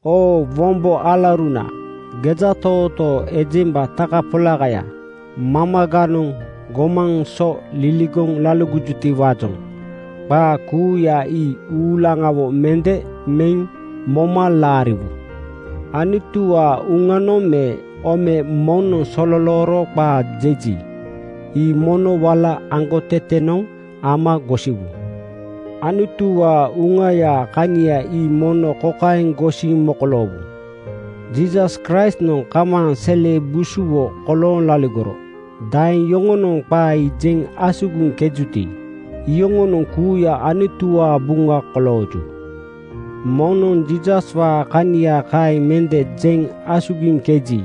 Oo wombo alauruna, gejatootoo ejemba takapolakaya mamaganoŋ gomaŋ so liligoŋ laligojutiwaajoŋ qaa kuuya ii uulaŋawo mende meŋ moma laariwu. Anutuwaa Uŋanoŋ me ome moŋnoŋ sololooro qaa jeji, ii mono wala aŋgotetenoŋ ama gosiwu. Anutuwaa Uŋayaa kania ii mono kokaeŋ gosiŋ mokoloowu, “Jiisas Kraistnoŋ kamaaŋ sele busuwo kolooŋ laligoro,” daeŋ yoŋonoŋ qaa ii jeŋ asugiŋkejuti, iyoŋonoŋ kuuya Anutuwaa buŋa kolooju. Moŋnoŋ Jiisaswaa kania kaeŋ mende jeŋ asugiŋkeji,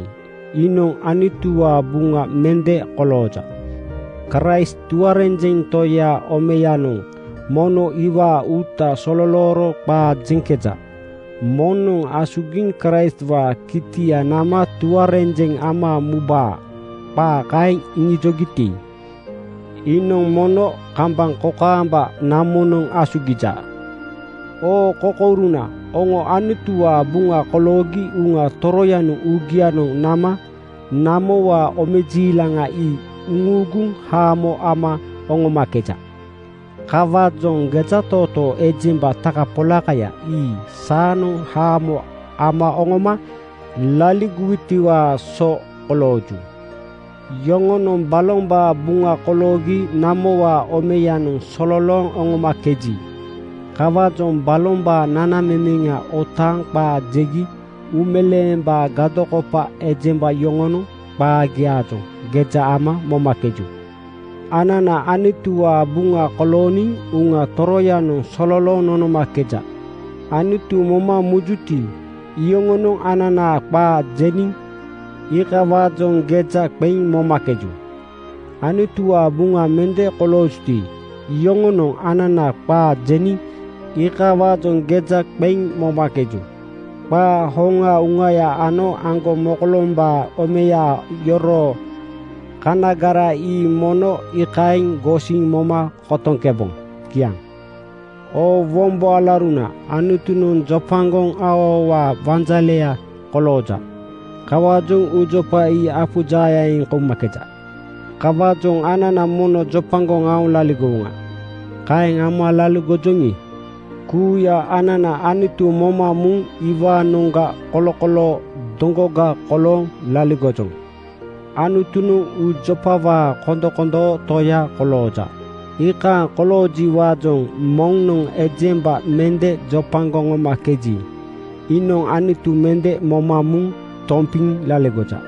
iinoŋ Anutuwaa buŋa mende kolooja. Kraist tuarenjeŋ Toyaa omeyanoŋ mono iwaa uuta sololooro qaa jeŋkeja. Moŋnoŋ asugiŋ Kraistwaa kitia nama tuarenjeŋ ama mubaa, qaa kaeŋ iŋijogiti, iinoŋ mono kambaŋ kokaamba namonoŋ asugija. Oo kokouruna, oŋo Anutuwaa buŋa koloogi Uŋa Toroyanoŋ uugianoŋ nama namowaa omejiilaŋa ii uŋuuguŋ haamo ama oŋomakeja. Kawaajoŋ gejatootoo ejemba takapolakaya ii saanoŋ haamo ama oŋoma laligowutiwaa so kolooju. Yoŋonoŋ balombaa buŋa koloogi namowaa omeyanoŋ sololooŋ oŋomakeju. Kawaajoŋ balombaa nanamemeŋa otaaŋ qaa jegi uumeleembaa gadokopa ejemba yoŋonoŋ qaagiaajoŋ geja ama momakeju. Anana Anutuwaa buŋa kolooniŋ Uŋa Toroyanoŋ sololooŋ nonomakeja. Anutu moma mujuti, iyoŋonoŋ ananaa qaa jeniŋ iikawaajoŋ geja qeŋ momakeju. Anutuwaa buŋa mende koloojuti, iyoŋonoŋ anana qaa jeniŋ iikawaajoŋ geja mende ama momakeju. Qaa hoŋaa Uŋaya ano aŋgomokolombaa omeya yoroo kanagara ii mono iikaeŋ gosiŋ moma kotoŋkeboŋ. Kiaŋ. Oo wombo alauruna, Anutunoŋ jopagoŋ aoaowaa wanjaleya kolooja. (Kawaajoŋ uujopa ii apu jaayaaŋ eŋ koumakeja.) Kawaajoŋ anana mono jopagoŋ aoŋ laligowoŋa. Kaeŋ ama laligojoŋi, kuuya anana Anutu moma muŋ iwaanoŋga kolokoloo doŋgoga kolooŋ laligojoŋ. Anutunoŋ uujopawaa kondokondoo Toya kolooja. Iikaaŋ koloojiwaajoŋ moŋnoŋ ejemba mende jopagoŋ oŋomakeji, iinoŋ Anutu mende moma muŋ tompiŋ laligoja.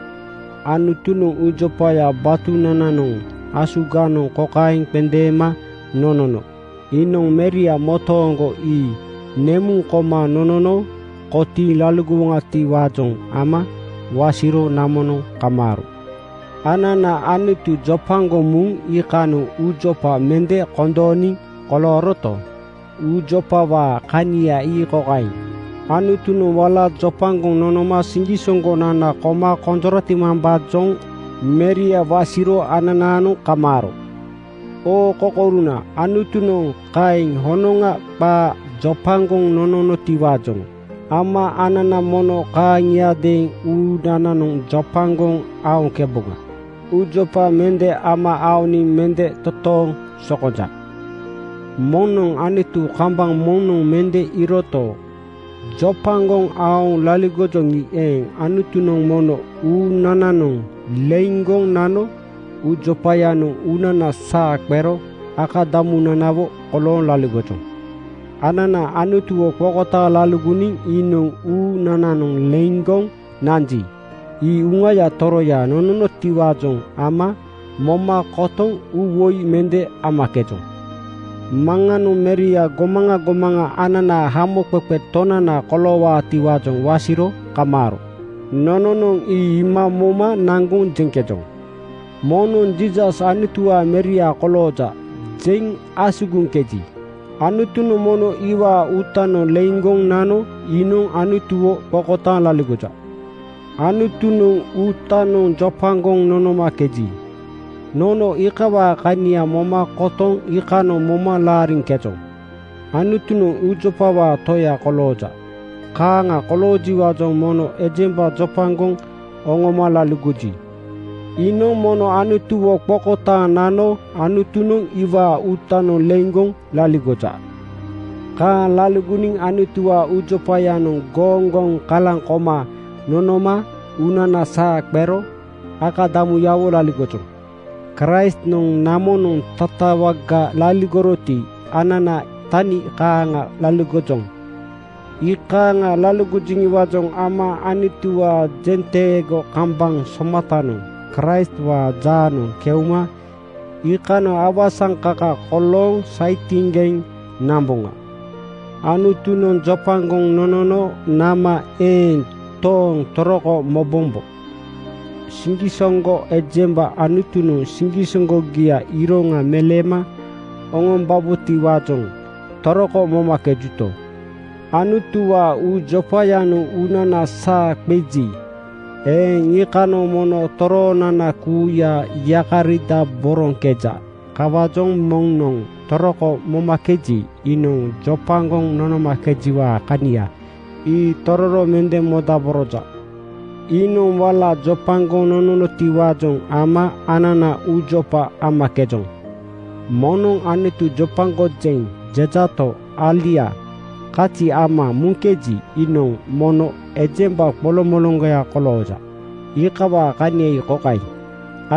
Anutunoŋ uujopaya batunananoŋ asuganoŋ kokaeŋ qendeema nonono: Iinoŋ Meria motooŋgo ii nemuŋ koma nonono kotiiŋ laligowoŋatiwaajoŋ ama wasiro namonoŋ kamaaro. Anana Anutu jopagoŋ muŋ iikanoŋ uujopa mende kondooniŋ kolooroto, uujopawaa kania ii kokaeŋ: Anutunoŋ wala jopagoŋ nonoma siŋgisoŋgonana koma konjoratimambaajoŋ Meria wasiro ananaanoŋ kamaaro. Oo kokouruna, Anutunoŋ kaeŋ honoŋa qaa jopagoŋ nononotiwaajoŋ ama anana mono kaaŋiadeeŋ uunananoŋ jopagoŋ aoŋkeboŋa. Uujopa mende ama aoniŋ mende totooŋ sokonja. Moŋnoŋ Anutu kambaŋ moŋnoŋ mende iiroto, jopagoŋ aoŋ laligojoŋi eeŋ, Anutunoŋ mono uunananoŋ leiŋgoŋ nano uujopayanoŋ uunana saa qero akadamunanawo kolooŋ laligojoŋ. Anana Anutuwo qokotaaŋ laligoniŋ iinoŋ uunananoŋ leiŋgoŋ nanji, ii Uŋaya Toroya nononotiwaajoŋ ama moma kotoŋ uuwoi mende amakejoŋ. Maŋanoŋ Meria gomaŋa gomaŋa ananaa Hamoqeqe Tonana koloowaatiwaajoŋ wasiro kamaaro. Nononoŋ ii iima moma naŋgoŋ jeŋkejoŋ. Moŋnoŋ “Jiisas Anutuwaa Meria kolooja,” jeŋ asugiŋkeji, Anutunoŋ mono iwaa uutanoŋ leiŋgoŋ nano iinoŋ Anutuwo qokotaaŋ laligoja. Anutunoŋ uutanoŋ jopagoŋ nonomakeji, nono iikawaa kania moma kotoŋ iikanoŋ moma laariŋkejoŋ. Anutunoŋ uujopawaa Toya kolooja. Kaaŋa koloojiwaajoŋ moŋnoŋ ejemba jopagoŋ oŋoma laligoji, iinoŋ mono Anutuwo qokotaaŋ nano Anutunoŋ iwaa uutanoŋ leiŋgoŋ laligoja. Kaaŋ laligoniŋ Anutuwaa uujopayanoŋ gooŋgoŋ kalaŋ koma nonoma uunana saa qero akadamunanawo laligojoŋ. Kraistnoŋ namonoŋ tatawaga laligoroti, anana tani kaaŋa laligojoŋ. Iikaaŋa laligojoŋiwaajoŋ ama Anutuwaa jenteego kambaŋ somatanoŋ Kraistwaa jaanoŋ keuma iikanoŋ awasaŋkaka kolooŋ saitiŋgeŋ namboŋa. Anutunoŋ jopagoŋ nonono nama eeŋ tooŋ toroko mobombo. Siŋgisoŋgo ejemba Anutunoŋ siŋgisoŋgogiaa iroŋa meleema oŋombabotiwaajoŋ toroko momakejuto, Anutuwaa uujopayanoŋ uunana saa qeji eeŋ, iikanoŋ mono toroonana kuuya yakaridaboroŋkeja. Kawaajoŋ moŋnoŋ toroko momakeji, iinoŋ jopagoŋ nonomakejiwaa kania ii tororo mende modaboroja. Iinoŋ wala jopagoŋ nononotiwaajoŋ ama anana uujopa amakejoŋ. Moŋnoŋ “Anutu jopagojeŋ,” jejato, alia kazi ama muŋkeji, iinoŋ mono ejemba qolomoloŋgoya kolooja. Iikawaa kania ii kokaeŋ: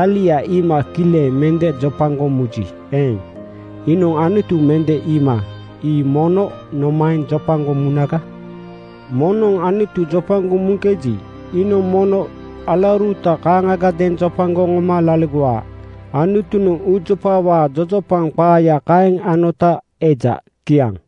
Alia iima kileŋ mende jopagoŋ muji eeŋ, iinoŋ Anutu mende iima ii mono nomaeŋ jopagoŋ munaga? Moŋnoŋ Anutu jopagoŋ muŋkeji, iinoŋ mono alauruta kaaŋagadeeŋ jopagoŋ oŋoma laligowa. Anutunoŋ uujopawaa jojopaŋ qaaya kaeŋ anota eja. Kiaŋ.